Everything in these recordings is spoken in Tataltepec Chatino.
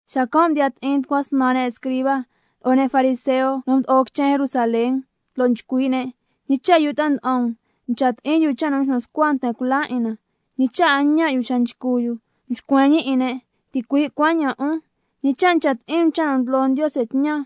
Xacan' mdiya ti'in tucua snan ne' escriba, lo'o ne' fariseo nu mdo'o quichen Jerusalén, lo' nchcui' ne': ¿Ñi cha' yu ta'a nda'an um ncha ti'in yu cha' nu mxnu scua nten cula 'in na? ¿Ñi cha' a ñaan' yu xa nchcu yu? Mxcuen ñi 'in ne': Ticui' cuaña'an 'un, ¿ñi cha' ncha ti'in um cha' nu ndlo Ndiose tñan,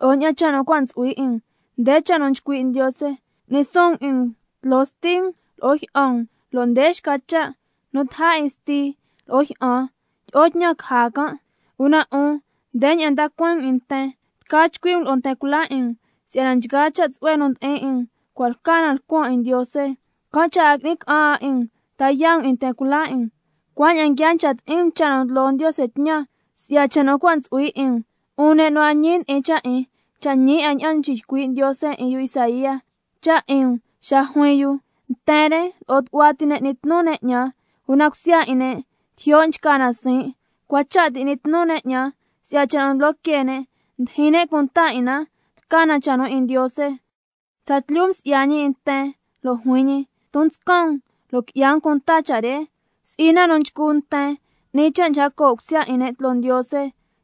lo'o ña'an cha' nu cua' ntsu'hui 'in um? Nde cha' nu nchcui' Ndiose: —Cu'ni suun um 'in um tloo sti um lo'o jyi'an um—, lo' nde xca cha': —Nu taja 'in sti lo'o jyi'an tyi'o tñan caja can'—. Una 'un ndeña'an nda cueen um 'in nten: Tca chcui' um lo'o nten cula 'in um, si'yana nchgaa cha' tsu'hue nu ndi'in 'in um cua' lca na lcuan 'in Ndiose, can' cha' a ngui'ni ca'an 'a 'in um ta yaa' um 'in nten cula 'in um. Cuaña'an nguia ncha ti'in um cha' nu ndlo Ndiose tñan si'ya cha' nu cua' ntsu'hui 'in um. 'Un ne' nu a ñi ndi'in cha' 'in, cha' ñi 'a ña'an mxiycui' Ndiose 'in yu Isaía cha' 'in um xa juin yu: —Nten re lo'o tu'hua ti ne' n'ni tnu ne' 'ñan, una cusya 'in ne' tijyo' nchca na siin'. Cua cha' ti n'ni tnu ne' 'ñan, si'yana cha' nu ndlo que ne' ndijin ne' cunta 'in na lca na cha' nu 'in Ndiose—. Tsatlyu msi'ya ñi 'in nten lo' juin ñi: Ton nscan um lo' qui'ya um cunta cha' re. Si'i na nu nchcu nten, n'ni cha' nchca coo' cusya 'in ne' tloo Ndiose,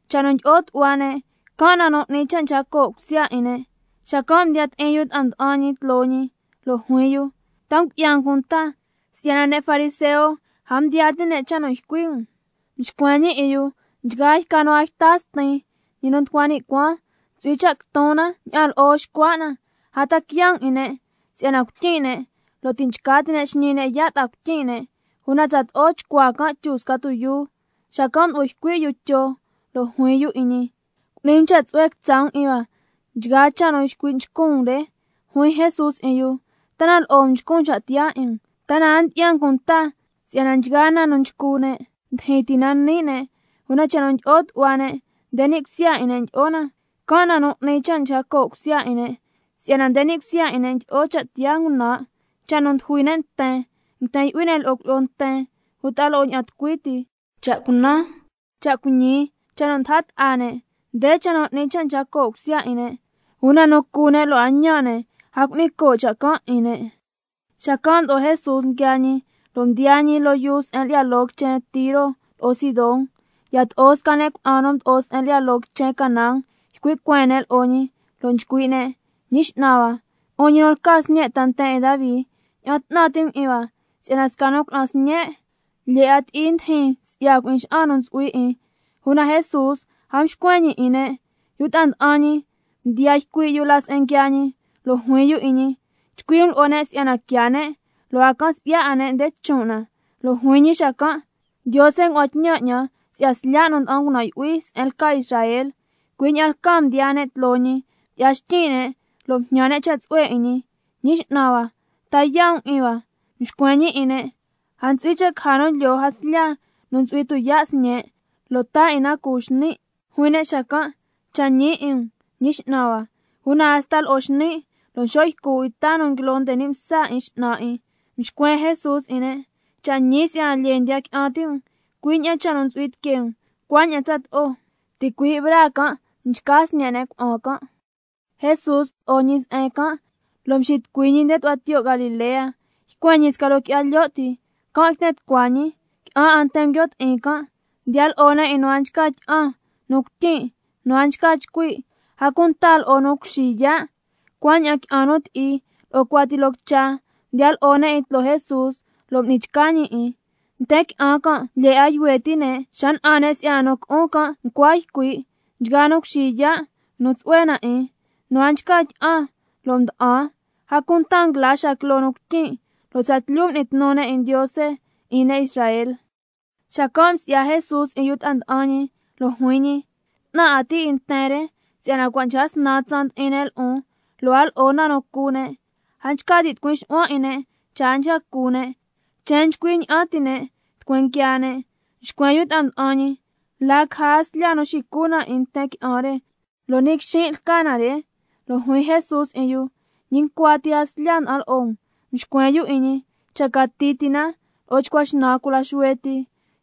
cha' nu ndyi'o tu'hua ne', can' nu n'ni cha' nchca coo' cusya 'in ne'. Xacan' mdiya ti'in yu ta'a nda'an ñi tloo ñi, lo' juin yu: ¿Ta ngu'ya um cunta si'yana ne' fariseo a mdiyaa ti' ne' cha' nu ycui' um? Mxcuen ñi 'in yu: Nchgaa yca nu a yta Stin, ñi nu nducua ni' cuaan, ntsu'hui cha' quiton na ña'an lo'o xcua' na. A ta quiya' um 'in ne', si'yana cuityin' ne' lo' ti' nchca ti' ne' xñi ne' yaa' ta'a cuityin' ne', una tsato'o chcuaa can' tyu sca tuyuu. Xacan' mdo'o ycui' yu Tyo lo' juin yu 'in ñi: Cu'ni um cha' tsu'hue quitsa' um 'in hua ña'an nguiaa cha' nu ycui' nchcun um re. Juin Jesús 'in yu: ¿Ta na lo'o um nchcun cha' tiyaa 'in um? ¿Ta na a ndyi'ya um cunta si'yana nchgaa na nu nchcu ne' ndyijyin ti na ni' ne'? Una cha' nu ndyi'o tu'hua ne', nde ni' cusya 'in ne' ndyi'o na, can' nu n'ni cha' nchca coo' cusya 'in ne'. Si'yana nde ni' cusya 'in ne' ndyi'o cha' tiyaa ngunan', cha' nu ndujui ne' nten, nguiten yu'hui ne' lo'o cuilyi'o nten uta lo'o ña'an tucui ti, cha' cunan, cha' cuiñi, cha' nu ndaja ta'a ne'. Nde cha' nu n'ni cha' nchca coo' cusya 'in ne', una nu cu ne' lo' a ñaan' ne', a cu'ni coo' cha' can' 'in ne'. Xacan' mdo'o Jesús nguiaa ñi, lo' mdiyaa ñi loo yuu se'en lyi'ya loo quichen Tiro lo'o Sidón. Yato'o sca ne' cuna'an nu mdo'o se'en lyi'ya loo Canaán ycui' cueen ne' lo'o ñi, lo' nchcui' ne': ¡Ñi X'nan hua, 'un ñi nu lca Sñe' ta nten 'in Davi, ña'an 'tnan ti' um 'in hua! Si'yana sca ne' cuna'an sñen' lyee 'a ti'i ndijin si'ya cui'in xa'an nu ntsu'hui 'in. Una Jesús a mxcuen ñi 'in ne'. Yu ta'a nda'an ñi mdiyaa yu cui' la se'en nguiaa ñi, lo' juin yu 'in ñi: Chcui' um lo'o ne' si'yana quiaa ne', lo' a can si'ya 'a ne' nde chon' na. Lo' juin ñi xacan': Ndiose ngua'an tñan 'ñan si'ya slya' nu nda'an ngunan' yu'hui se'en lca Israel. Cui' ña'an lcaa mdiyaa ne' tloo ñi, mdyi'ya xtyin' ne', lo' mjñan ne' cha' tsu'hue 'in ñi: ¡Ñi X'nan hua, ta yaa' um 'in hua! Mxcuen ñi 'in ne': A ntsu'hui cha' caja nu lyoo jaslya nu ntsu'hui tuyaa' sñe', lo' taa 'in na cu xni'. Juin ne' xacan': Cha' ñi 'in um, Ñi X'nan hua, una hasta lo'o xni', lo' nxo' ycu 'in ta nu nguilo nde ni' msa 'in x'nan 'in. Mxcuen Jesús 'in ne': Cha' ñi si'yana lyee ndiya qui'an ti' um, cui' ña'an cha' nu ntsu'hui tiquee um cuaña'an tsato'o. Ticui' braa can' mchca sñe' ne' cuna'an can'. Jesús mdo'o ñi se'en can' lo' mxitucui ñi nde tu'hua tiyo' Galilea, ycuen ñi sca loo qui'ya lyo' ti, can' yten tucua ñi. Qui'an 'a nten nguio' ti'in can', mdiya lo'o ne' 'in nu a nchca tyi'an, nu cuityin', nu a nchca chcui', a cunta lo'o nu cuxi yaa', cuaña'an qui'an nu ti'i lo'o cuati loo quicha, mdiya lo'o ne' 'in tloo Jesús, lo' m'ni chca ñi 'in. Nten qui'an can' lyee 'a yuhue ti' ne' xa na'an ne' si'yana nu cu'un can' ncua ycui', nchgaa nu cuxi yaa' nguinu tsu'hue na 'in, nu a nchca tyi'an lo' mdyisnan mda'an, a cunta nguila xaa quiloo nu cuityin', lo' tsatlyu m'ni tnu ne' 'in Ndiose 'in ne' Israel. Xacan' msi'ya Jesús 'in yu ta'a nda'an ñi, lo' juin ñi: 'Tnan 'a tin' 'in nten re si'yana cua' nchca snan tsaan ndi'in ne' lo'on, lo' a lo'o 'a na nu cu ne', a nchca tin' tucui xu'huan 'in ne' cha' a nchca cu ne', chen nchcui ña'an ti' ne' tucueen quiaa ne'. Mxcuen yu ta'a nda'an ñi: ¿La caja jaslya xicu na 'in nten qui'an re, lo' ni' quixin' lca na re? Lo' juin Jesús 'in yu: ¿Ñi ncua jaslya ti' nda'an lo'o um? Mxcuen yu 'in ñi: Cha cati ti na lo'o chcua xnan cula xuhue ti.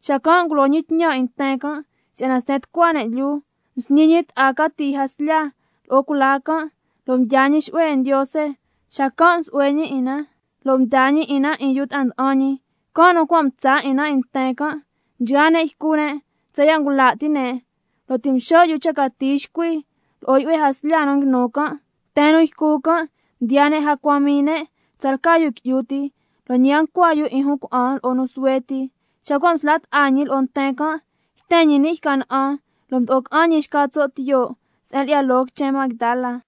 Xacan' ngulo ñi tñan 'in nten can' si'yana sten tucua ne' lyuu. Msñi ñi ta'a cati jaslya lo'o cula can', lo' mdyaa ñi xu'hue 'in Ndiose, xacan' msu'hue ñi 'in na lo' mdaa ñi 'in na 'in yu ta'a nda'an ñi, can' nu cua' mtsa 'in na 'in nten can'. Nchgaa ne' ycu ne' tsaya' ngula' ti' ne', lo' ti' mxo' yu tsa cati xcuhui lo'o yu'hue jaslya nu nguinu can'. Nten nu ycu can' mdiyaa ne' jacua mii ne' tsalca yu qui'yu ti, lo' ñi a ncua yu 'in jun cuna'an lo'o nu suhue ti. Xa cua' msla' ta'a ñi lo'o nten can', yten ñi ni' yca na'an, lo' mdo'o ca'an ñi xca tso' tiyo' se'en lyi'ya loo quichen Magdala.